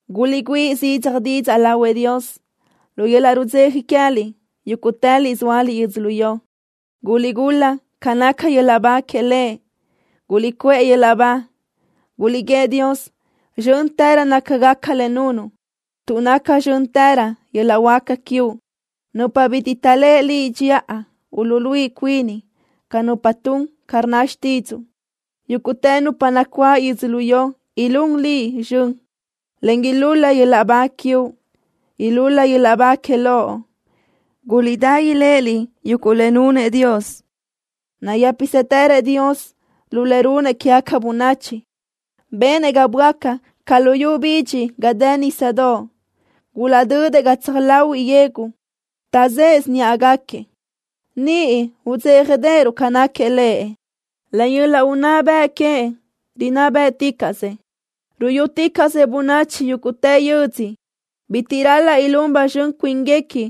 ¡Guliʼgüíʼ zidzaj didzaʼ lahuëʼ Dios lu yöl-laʼ rudzeja queë́liʼ yúguʼtëliʼ zóaliʼ yödzölió! ¡Guliʼgul-la ca naca yöl-laʼ ba que Lëʼ! ¡Guliʼcuʼë yöl-laʼ ba! Guliʼguíëʼ Dios: “¡Zxö́ntërö nácagaca le nunuʼ tuʼ naca zxö́ntërö yöl-laʼ huáca quiuʼ!” Nupa bitiʼ taʼléʼe Liʼ dxiʼa uluʼluíʼi cuini ca nupa tun ca rnna xtídzuʼu. Yúguʼtë nupa nacuáʼ yödzölió ilún Liʼ zxön, en ilúl-la yöl-laʼ ba quiuʼ. Ilúl-la yöl-laʼ ba que Loʼ. Guliʼdá iléʼeliʼ yuguʼ le nunëʼ Dios. Nayë́pisëtërëʼ Dios lu le runëʼ quégaca bönachi. Benëʼ ga böáca ca luyú bidxi ga dë nísadoʼ. Gulaʼdödëʼ gatsaj láhuiʼlö yegu, taʼzë́ʼesö níʼagaquiëʼ. Niʼ udzéjadeʼeruʼ ca náquiëʼ Lëʼ. Len yöl-laʼ unná bëʼ queëʼ rinná bë́ʼticaʼsëʼ. Ruyúticaʼsëʼ bönachi yúguʼtë yödzö. Bitiʼ ral-laʼ ilún ba zxön cuínguequi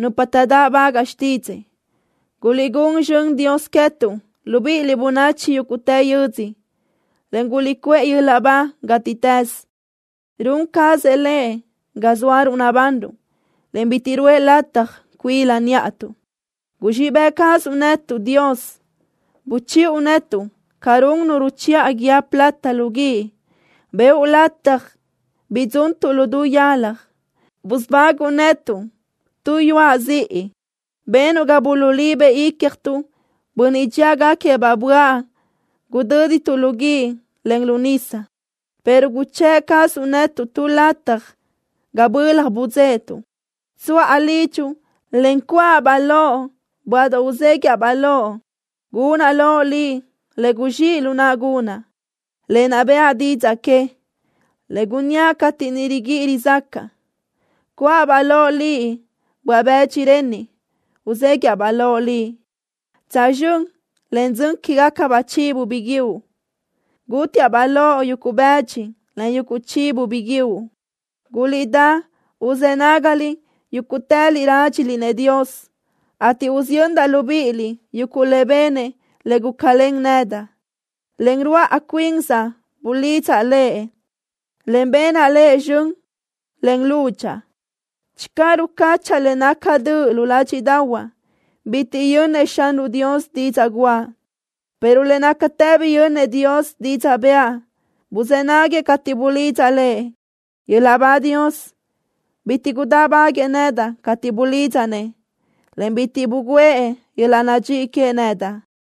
nupa taʼdáʼbagaʼ xtídzëʼë. ¡Guliʼgún zxönëʼ Dios queë́tuʼ, libíʼiliʼ bönachi yúguʼtë yödzö, en guliʼcuʼë yöl-laʼ ba gátiʼtës! ¡Run cazëʼ Lëʼ ga zóaruʼ nabanruʼ, en bitiʼ ruʼë lataj cuila níʼatuʼ! Guzxíʼ bëʼ cazuʼ netuʼ, Dios. Buchiʼu netuʼ ca run nu ruchiʼa guíë plata lu guíʼ. Bëʼu lataj bidzuntuʼ lu du yalaj. Busubáguʼu netuʼ tu yuaʼ ziʼi. Benuʼ ga gulaʼlibëʼ icjtuʼ bönniʼ dxíagaquiëʼ-baʼ böaʼ. Gudö́dituʼ lu guíʼ, en lu nisa, pero guchë́ʼ cazuʼ netuʼ tu lataj ga bölaj budzéʼetuʼ. Tsuʼa lidxuʼ, en cuʼa-baʼ loʼ böaʼdoʼ uzéguiʼa-baʼ loʼ. Gunaʼ loʼ Liʼ le guzxíʼ lu naʼa gunaʼ, lë naʼ bëʼa didzaʼ que, le gunníaʼ cateʼ niʼ riguíʼi rizácaʼa. Cuʼa-baʼ loʼ Liʼ böaʼ-bëdxi renniʼ uzéguiʼa-baʼ loʼ, tsözxö́n len dzön quégacabaʼ chivo biguiúʼ. Gútiaʼ-baʼ loʼ yuguʼ bëdxi, en yuguʼ chivo biguiúʼ. Guliʼdá uzë́ nágaliʼ, yúguʼtëliʼ rádxiliʼ-nëʼ Dios, ateʼ usiyöndaʼ libíʼiliʼ yuguʼ le benëʼ le gulácalen nedaʼ. Len ruáʼ cuinsaʼ bulidzaʼ Lëʼ, en benaʼ Lëʼ zxön len lúdxaʼa. Channö rucáchaʼa le naca döʼ lu ládxiʼdaʼahuaʼ, bitiʼ yönnëʼ Xanruʼ Dios didzaʼ guʼa, pero le nácatë biyönnëʼ Dios didzaʼ bëʼa. Buzë́ naguëʼ cateʼ bulidzaʼ Lëʼ. ¡Yöl-laʼ ba Dios! ¡Bitiʼ gudáʼbaguëʼë nedaʼ cateʼ bulidzaʼ-nëʼ, en bitiʼ bugǘëʼ yöl-laʼ nadxíʼi queëʼ nedaʼ!